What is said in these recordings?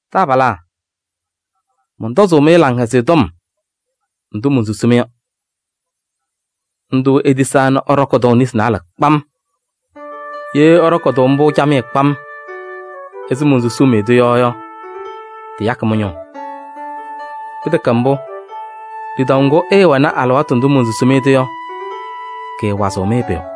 Taabalaa, mɔntɔzʋʋ-mɩ Laŋhɛzɩyɛ Tɔm ndʋ monsusi-mɩ yɔ. Ndʋ itisaa nɛ ɩɖɔkɩ-tʋ nesi naalɛ kpam. Ye ɩɖɔkɩ-tʋ mbʋ camɩyɛ kpam ɛzɩ monsusuu-mɩ-tʋ yɔ yɔ, tɩyakɩ mɩ-ñʋʋ. Pɩtɛkɛ mbʋ, lidaʋ ŋgʋ ɩɩwɛnɩ alɩwaatʋ ndʋ monsusi-mɩ-tʋ yɔ, kɩɩwazɩɣ-mɩ pʋyʋ.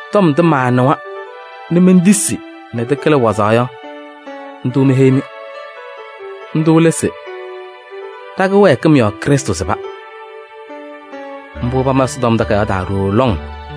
Tɔm ndʋ maanɩwa nɛ mentisi nɛ tɩkɩlɩ wazaɣ yɔ, ndʋ meheyi-mɩ. Ndʋ lɛ se: ɖa-kɩwɛɛkɩm yɔɔ Krɩstʋ sɩba. Mbʋ pama Ɛsɔtɔm Takayaɣ taa ɖooo lɔŋ.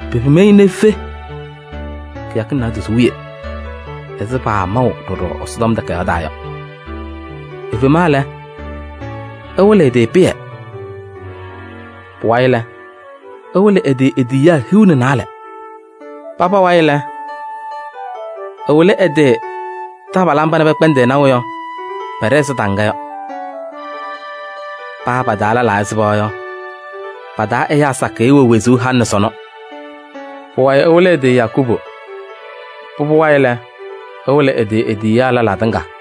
Pepim-i nɛ efe kɩyakɩŋ naadozo wiye ɛzɩ paamaʋ ɖɔɖɔ Ɛsɔtɔm Takayaɣ taa yɔ. Efema lɛ, ɛwɩlɩ ɛ-tɩ Pɩyɛ. Pʋwayɩ lɛ, ɛwɩlɩ ɛ-tɩ e-tiyiyaa hiu nɛ naalɛ. Paba wayɩ lɛ, ɛwɩlɩ ɛ-tɩ taabalaa mba nɛ pɛkpɛndɩ-ɩ naʋ yɔ, pɛɖɛ ɛzɩ taŋga yɔ. Paa pa-taa lɛlaa ɛsɩba yɔ, pa-taa ɛyaa sakɩyɛ wɛ wezuu halɩ nɛ sɔnɔ. Pʋwayɩ ɛwɩlɩ ɛ-tɩ Yakubu. Pʋbʋ wayɩ lɛ, ɛwɩlɩ ɛ-tɩ e-tiyiyaa lɛlaa tɩŋa.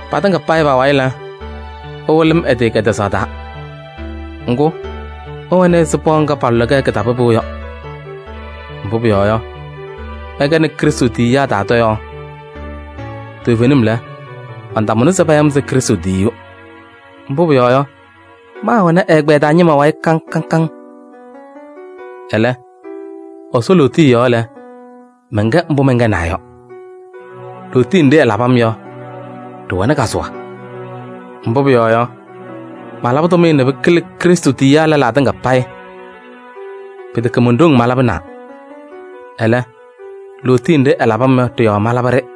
Patɩŋa payɩ pa-wayɩ lɛ, ɛwɩlɩ-m ɛ-tɩ kɛtɛzaɣ taa. Ŋgʋ, mɛwɛnɩ ɛzɩ pɩɣa ŋga palʋlɩ-kɛ kɩtapɩpʋʋ yɔ. Mbʋ pʋyɔɔ yɔ, mɛnkɛnɩ Krɩstʋ tiyiyaa taa tɔyaɣ. Toovenim lɛ, mantamʋna se paya-m se Krɩstʋ tiyiyu. Mbʋ pʋyɔɔ yɔ, maawɛnɩ ɛ-ɛgbɛyɛ taa ñɩma wayɩ kaŋ kaŋ. Ɛlɛ, Ɛsɔ lootiye yɔɔ lɛ, mɛnkɛ mbʋ mɛnkɛnaa yɔ. Lootiye nɖɩ ɛlabɩ-m yɔ, ɖɩwɛnɩ kazʋwa. Mbʋ pʋyɔɔ yɔ, malabɩ tʋmɩyɛ nɛ pɩkɩlɩ Krɩstʋ tiyiyaa lɛlaa tɩŋa payɩ. Pɩtɛkɛ mon-ɖoŋ malabɩnaa, ɛlɛ, lootiye nɖɩ ɛlabɩ-m yɔ ɖɩ-yɔɔ malabɩ-ɖɩ.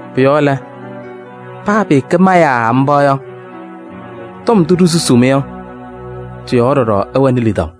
Pʋ-yɔɔ lɛ, paa pɩɩkɛ ma yaa mba yɔ, tɔm ndʋ ɖisusuu-mɩ yɔ, tɩ-yɔɔ ɖɔɖɔ ɩwɛnɩ lidaʋ.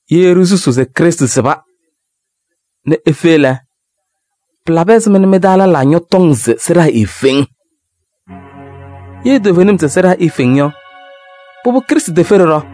Ye ɖisusuu se Krɩstʋ sɩba nɛ efe lɛ, pɩlabɩ ɛzɩma mɩ-taa lɛlaa ñɔtɔŋ se sɩɖaa eefeŋ? Ye toovenim se sɩɖaa eefeŋ yɔ, pʋbʋ Krɩstʋ tefe ɖɔɖɔ.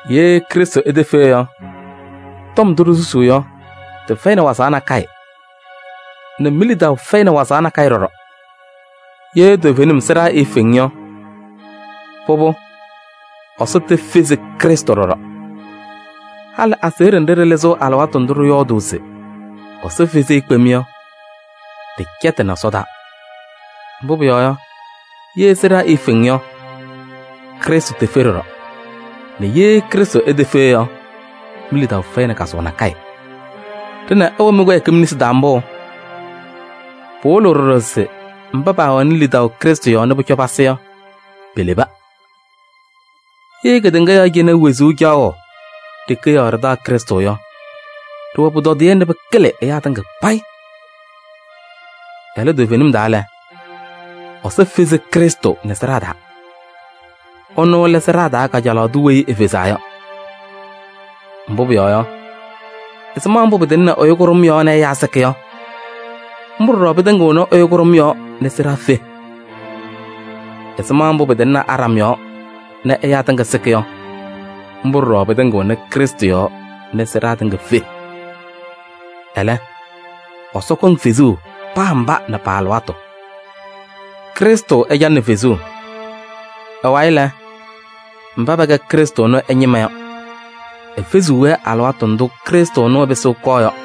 Ye Krɩstʋ etefe yɔ, tɔm ndʋ ɖisusuu yɔ, tɩfɛyɩnɩ wazaɣ nakɛyɛ nɛ mi-lidaʋ fɛyɩnɩ wazaɣ nakɛyɛ ɖɔɖɔ. Ye toovenim sɩɖaa eefeŋ yɔ, pʋbʋ Ɛsɔ tefezi Krɩstʋ ɖɔɖɔ. Halɩ aseɣɖe nɖɩ ɖɩlɩzɩɣ alɩwaatʋ ndʋ ɖɩyɔɔdʋʋ se Ɛsɔ fezi-i kpem yɔ, ɖɩcɛtɩnɩ Ɛsɔ taa. Mbʋ pʋyɔɔ yɔ, ye sɩɖaa eefeŋ yɔ, Krɩstʋ tefe ɖɔɖɔ. Nɛ ye Krɩstʋ etefe yɔ, mi-lidaʋ fɛyɩnɩ kazʋwa nakɛyɛ. Ɖɩnɛ ɩwɛ mɩ-kɩwɛɛkɩm nesi taa mbʋ. Pɩwɩlɩɣ ɖɔɖɔ se mba paawɛnɩ lidaʋ Krɩstʋ yɔɔ nɛ pʋcɔ pasɩ yɔ, peleba. Ye kedeŋa yɔɔ cɩnɛ wezuu caɣʋ ɖeke yɔɔ ɖɩtaɣ Krɩstʋ yɔ, ɖɩwɛ pʋtɔdɩyɛ nɛ pɩkɩlɩ ɛyaa tɩŋa payɩ. Ɛlɛ toovenim taa lɛ, Ɛsɔ fezi Krɩstʋ nɛ sɩɖaa taa. Ɛnʋ lɛ sɩɖaa taa kajalaɣ tʋ weyi efezaa yɔ. Mbʋ pʋyɔɔ yɔ, ɛzɩma mbʋ pɩtɩŋnɩ ɛyʋ kʋɖʋm yɔɔ nɛ ɛyaa sɩkɩ yɔ, mbʋ ɖɔɖɔ pɩtɩŋɩɣnɩ ɛyʋ kʋɖʋm yɔɔ nɛ sɩɖaa fe. Ɛzɩma mbʋ pɩtɩŋnɩ Aɖam yɔɔ nɛ ɛyaa tɩŋa sɩkɩ yɔ, mbʋ ɖɔɖɔ pɩtɩŋɩɣnɩ Krɩstʋ yɔɔ nɛ sɩɖaa tɩŋa fe. Ɛlɛ, Ɛsɔ kɔŋ fezuu paa mba nɛ pa-alɩwaatʋ: Krɩstʋ ɛcalɩnɩ fezuu. Ɛ-wayɩ lɛ, mba pɛkɛ Krɩstʋ ɛnʋ ɛ-ñɩma yɔ, efeziɣ-wɛ alɩwaatʋ ndʋ Krɩstʋ pɩsɩɣ ɛkɔɔ yɔ.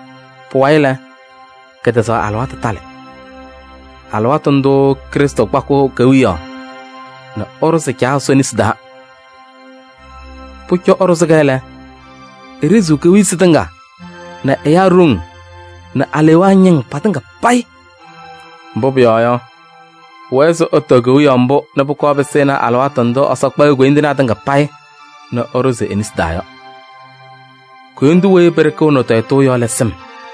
Pʋwayɩ lɛ, kɛtɛzaɣ alɩwaatʋ talɩ: alɩwaatʋ ndʋʋ Krɩstʋ kpakɩɣ kewiyaɣ nɛ ɛɖʋzɩ Caa Ɛsɔ nesi taa. Pʋcɔ ɛɖʋzɩ-kɛ lɛ, eɖeziɣ kewiyisi tɩŋa nɛ ɛyaa ɖoŋ nɛ alewaa ñɩŋ pɩtɩŋa payɩ. Mbʋ pʋyɔɔ yɔ, pʋwɛɛ se ɛtɔɔ kewiyaɣ mbʋ nɛ pʋkɔɔ pɩsɩnɩ alɩwaatʋ ndʋ Ɛsɔ kpa e-koyindinaa tɩŋa payɩ nɛ ɛɖʋzɩ-wɛ e-nesi taa yɔ. Koyindu weyi pɩɖɩkɩɣnɩ-ɩ tɔyɩtʋʋ yɔ lɛ sɩm.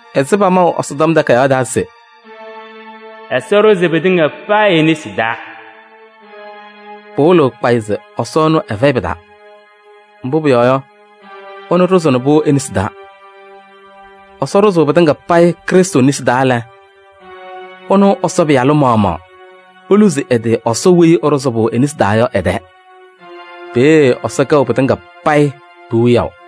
Ɛzɩ pamaʋ Ɛsɔtɔm Takayaɣ taa se: “Ɛsɔ ɖʋzɩ pɩtɩŋa payɩ e-nesi taa yɔ” pɩwɩlɩɣ kpayɩ se Ɛsɔ ɛnʋ ɛfɛyɩ pɩ-taa. Mbʋ pʋyɔɔ yɔ, ɛnʋ ɖʋzɩnɩ-pʋ e-nesi taa. Ɛsɔ ɖʋzʋʋ pɩtɩŋa payɩ Krɩstʋ nesi taa lɛ, ɛnʋ Ɛsɔ Pɩyalʋ maɣmaɣ eluzi ɛ-tɩ Ɛsɔ weyi ɛɖʋzʋʋ-pʋ e-nesi taa yɔ ɛ-tɛɛ. Peeye Ɛsɔ kɛɣ pɩtɩŋa payɩ pi-wiyaʋ.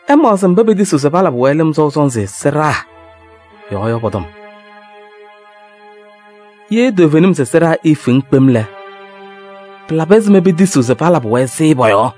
Ɩmaɣzɩ mba petisiɣ se palabɩ-wɛ lɩm sɔʋ sɔnzɩ sɩɖaa yɔɔ yɔ pɔ-tɔm. Ye toovenim se sɩɖaa eefeŋ kpem lɛ, pɩlabɩ ɛzɩma petisiɣ se palabɩ-wɛ-sɩ pɔ-yɔɔ?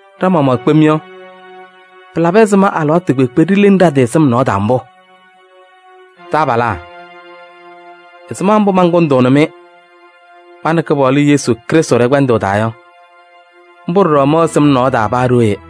Ɖa-maɣmaɣ kpem yɔ, pɩlabɩ ɛzɩma alɩwaatʋ kpeekpe ɖileŋ ɖa-tɩ sɩm nɔɔ taa mbʋ? Taabalaa, ɛzɩma mbʋ mankʋndʋʋnɩ-mɩ ma nɛ Kɩpaɣlʋ Yesu Krɩstʋ ɖɛ-kpɛndʋʋ taa yɔ, mbʋ ɖɔɖɔ mɛwɛ sɩm nɔɔ taa paa ɖooye.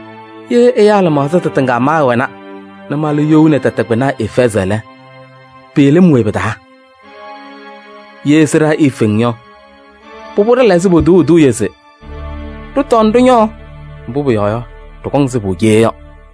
Ye ɛyaa lɩmaɣza tɩtɩŋa maawɛna nɛ mala you nɛ tɛtɛ kpɩna Efɛɛzɩ lɛ, pɩɩlɩ-m we pɩ-taa? Ye sɩɖaa eefeŋ yɔ, pʋbʋ ɖɩla ɛzɩ potuuu eduuye se: “Ɖɩtɔɔ nɛ ɖɩñɔɔ, mbʋ pʋyɔɔ yɔ, ɖɩkɔŋ sɩbʋ cee” yɔ.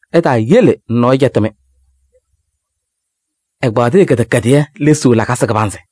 Ɩtaayele nɛ nɔɔyʋ cɛtɩ-mɩ: “Ɛgbaaɖɩyɛ kɩdɛkɛdɩyɛ lesiɣ lakasɩ kɩbanzɩ.”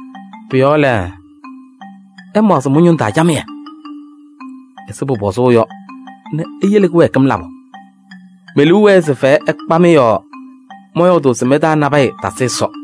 Pʋ-yɔɔ lɛ, ɩmaɣzɩ mɩ-ñʋŋ taa camɩyɛ ɛzɩ pʋpɔzʋʋ yɔ nɛ iyele kɩwɛɛkɩm labʋ. Me-liu wɛɛ se fɛyɛ ɛkpa-mɩ yɔɔ mɔyɔɔdʋʋ se mɩ-taa nabɛyɛ tasɩ Ɛsɔ.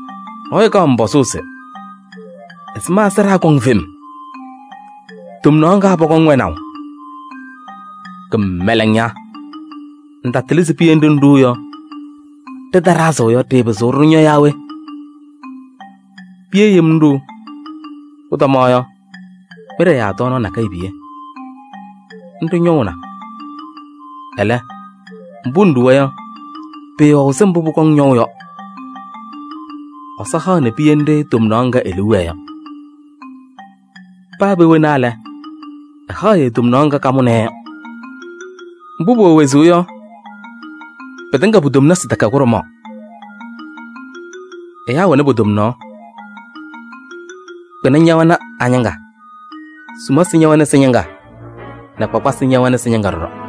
Nɔɔyʋ kaɣ pɔzʋʋ se: “Ɛzɩma sɩɖaa kɔŋ fem? Tomnaɣ ŋga pɔkɔŋ wɛnaʋ?” Kɩmɛlɛŋ ña! Ŋtatɩlɩ se piye nɖɩ ŋɖuu yɔ, ɖɩtaɖazɩ yɔ, ɖɩɩpɩzɩɣ ɖɩñɔ yaa we? Piye yem ŋɖuu. Pʋtɔma yɔ, mɩɖɛ yaa tɔɔnaɣ nakɛyɛ piye, nɖɩ ñɔʋna. Ɛlɛ, mbʋ ŋɖuwa yɔ, pɩɩwɛɣ ɛzɩ mbʋ pʋkɔŋ ñɔʋ yɔ. Ɛsɔ haɣnɩ piye nɖɩ tomnaɣ ŋga e-liu wɛɛ yɔ. Paa pee wena lɛ, ɛhaɣ-yɛ tomnaɣ ŋga kamʋnɩ-yɛ yɔ. Mbʋ pʋwɛ wezuu yɔ, pɩtɩŋa pu-tomnasɩ tɛkɛ kʋɖʋmaɣ: ɛyaa wɛnɩ po-tomnaɣ, kpɩna ñɛwɛnɩ a-ñɩŋga, sumasɩ ñɛwɛnɩ sɩ-ñɩŋga nɛ kpakpasɩ ñɛwɛnɩ sɩ-ñɩŋga ɖɔɖɔ.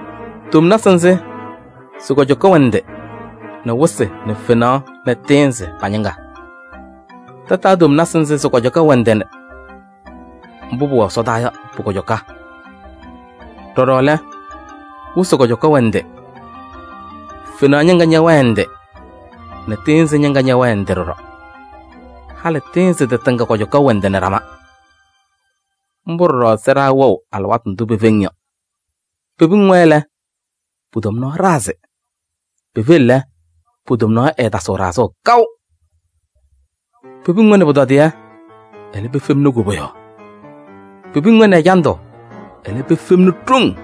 Tomnasɩ nzɩ sɩ-kɔjɔka wɛ ndɩ nɛ wɩsɩ nɛ fenaɣ nɛ tɩɩnzɩ pa-ñɩŋga. Tataa tomnasɩ nzɩ sɩ-kɔjɔka wɛ ndɩ nɛ mbʋ pʋwɛ ɛsɔdaa yɔ pʋ-kɔjɔka. Ɖɔɖɔ lɛ, wɩsɩ kɔjɔka wɛ ndɩ, fenaɣ ñɩŋga ñɛwɛɛ ndɩ nɛ tɩɩnzɩ ñɩŋga ñɛwɛɛ ndɩ ɖɔɖɔ. Halɩ tɩɩnzɩ tɩtɩŋa kɔjɔka wɛ ndɩ nɛ ɖama. Mbʋ ɖɔɖɔ sɩɖaa wɛɣ alɩwaatʋ ndʋ pefeŋ yɔ. Pepiŋ-wɛ lɛ, po-tomnaɣ ɖazɩ, pefeŋ lɛ, po-tomnaɣ ɛɛtasɩɣ ɖazʋʋ kaʋ. Pepiŋ-wɛ nɛ pʋtɔdɩyɛ, ɛlɛ pefemni koboyaɣ. Pepiŋ-wɛ nɛ ɛjandʋ, ɛlɛ pefemni ɖoŋ.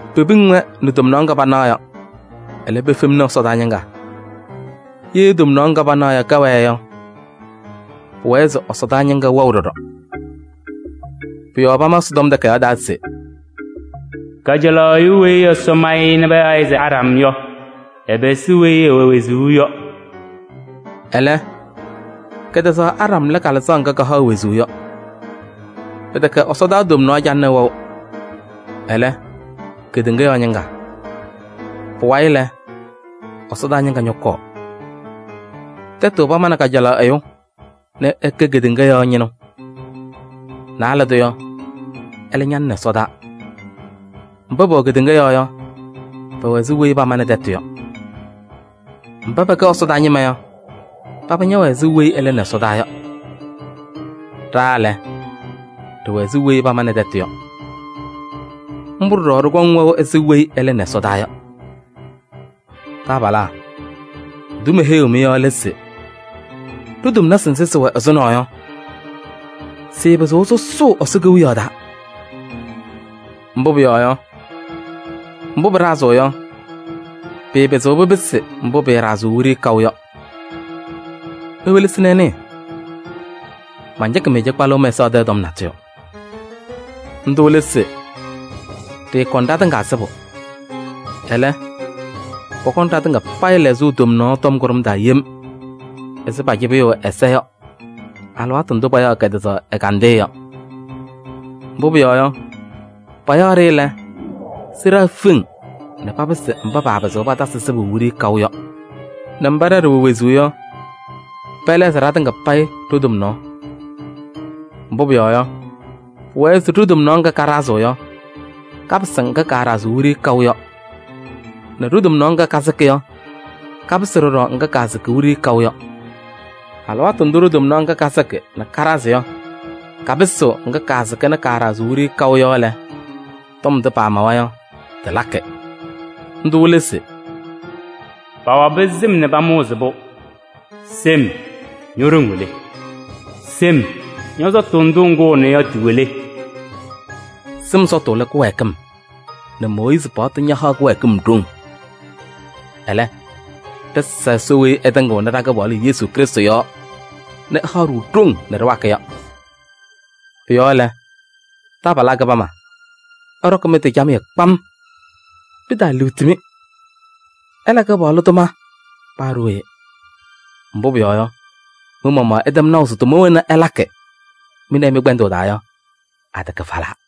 Pepiŋ-wɛ nɛ tomnaɣ ŋga panaɣ yɔ, ɛlɛ pefemni ɛsɔdaa ñɩŋga. Ye tomnaɣ ŋga panaɣ yɔ kɛwɛɛ yɔ, pʋwɛɛ se ɛsɔdaa ñɩŋga wɛɣ ɖɔɖɔ. Pʋ-yɔɔ pama Ɛsɔtɔm Takayaɣ taa se: “Kajalaɣ ɛyʋ weyi Ɛsɔ ma-ɩ nɛ payaɣ-ɩ se Aɖam yɔ, ɛpɩsɩ weyi ɛwɛ wezuu yɔ.” Ɛlɛ, kɛtɛzaɣ Aɖam lɛ Kalɩzaɣ ŋga kahaɣ wezuu yɔ. Pɩtɛkɛ ɛsɔdaa tomnaɣ calɩnɩ wɛʋ, ɛlɛ, kedeŋa yɔɔ ñɩŋga. Pʋwayɩ lɛ, ɛsɔdaa ñɩŋga ñɔkɔɔ. Tɛtʋ pamanɩ kajalaɣ ɛyʋ nɛ ɛkɛ kedeŋa yɔɔ ñɩnʋ. Naalɛ tʋ yɔ, ɛlɛ ñalɩnɩ ɛsɔdaa. Mba pɛwɛ kedeŋa yɔɔ yɔ, pɛwɛ ɛzɩ weyi pamanɩ tɛtʋ yɔ. Mba pɛkɛ ɛsɔdaa ñɩma yɔ, paba ñɛwɛ ɛzɩ weyi ɛlɩnɩ ɛsɔdaa yɔ. Ɖa lɛ, ɖɩwɛ ɛzɩ weyi pamanɩ tɛtʋ yɔ. Mbʋ ɖɔɖɔ ɖɩkɔŋ wɛʋ ɛzɩ weyi ɛlɩnɩ ɛsɔdaa yɔ. Taabalaa, ndʋ meheyiɣ-mɩ yɔ lɛ se: ɖo-tomnasɩ nzɩ sɩwɛ ɛzʋnɔ yɔ, sɩɩpɩzɩɣ sʋsʋʋ Ɛsɔ Kewiyaɣ taa. Mbʋ pʋyɔɔ yɔ, mbʋ pɩɖazɩɣ yɔ, pɩɩpɩzɩɣ pɩpɩsɩ mbʋ pɩɩɖazɩɣ wiɖiyi kaʋ yɔ. Iwelesi nɛ ɩnɩɩ: mancɩkɩ-mɩ cɩkpalʋʋ mɛsaɣ tɛɛ tɔm natʋyʋ. Ndʋ lɛ se: ɖɩɩkɔŋ ɖatɩŋa sɩbʋ. Ɛlɛ, pɔkɔŋ ɖatɩŋa payɩ lɛɣzʋʋ tomnaɣ tɔm kʋɖʋm taa yem ɛzɩ pacɩbɩyʋʋ ɛza yɔ alɩwaatʋ ndʋ payaɣ kɛtɛzaɣ ɛgandɩyɛ yɔ. Mbʋ pʋyɔɔ yɔ, payaɣ-ɖɩ lɛ, sɩɖaa feŋ nɛ papɩsɩ mba paapɩzɩɣ patasɩ sɩbʋ wiɖiyi kaʋ yɔ nɛ mba ɖa ɖɩwɛ wezuu yɔ, pɛlɛɣzɩ ɖatɩŋa payɩ ɖo-tomnaɣ. Mbʋ pʋyɔɔ yɔ, pʋwɛɛ se ɖo-tomnaɣ ŋga kaɖazɩɣ yɔ, kapɩsɩ ŋga kaaɖazɩɣ wiɖiyi kaʋ yɔ nɛ ɖo-tomnaɣ ŋga kasɩkɩ yɔ, kapɩsɩ ɖɔɖɔ ŋga kaasɩkɩ wiɖiyi kaʋ yɔ. Alɩwaatʋ ndʋ ɖo-tomnaɣ ŋga kasɩkɩ nɛ kaɖazɩ yɔ kapɩsɩɣ ŋga kaasɩkɩ nɛ kaaɖazɩɣ wiɖiyi kaʋ yɔ lɛ, tɔm ndʋ pamawa yɔ tɩlakɩ. Ndʋ lɛ se: “Pawabɩ sɩm nɛ pamʋʋzɩ-pʋ. Sɩm, ño-ɖoŋ wɛ le? Sɩm, ñɔ-sɔtʋ ndʋ ŋkʋʋna yɔ tɩwɛ le?” Sɩm sɔtʋ lɛ kɩwɛɛkɩm nɛ Mooyiizi paɣtʋ ñahaɣ kɩwɛɛkɩm ɖoŋ. Ɛlɛ, ɖɩsa Ɛsɔ weyi ɛtɩŋɩɣnɩ ɖa-Kɩpaɣlʋ Yesu Krɩstʋ yɔɔ nɛ ɛhaɣ-ɖʋ ɖoŋ nɛ ɖɩwakɩ yɔ. Pʋ-yɔɔ lɛ, taabalaa kɩbama, ɩɖɔkɩ mɩ-tɩ camɩyɛ kpam. Pɩtaaliɣti-mɩ, ɩla Kɩpaɣlʋ tʋma paa ɖooye. Mbʋ pʋyɔɔ yɔ, mɩ-maɣmaɣ ɩtɛm naʋ se tʋma wena ɩlakɩ mɩ nɛ ɩ mɩ-kpɛndʋʋ taa yɔ, atɛkɛ falaa.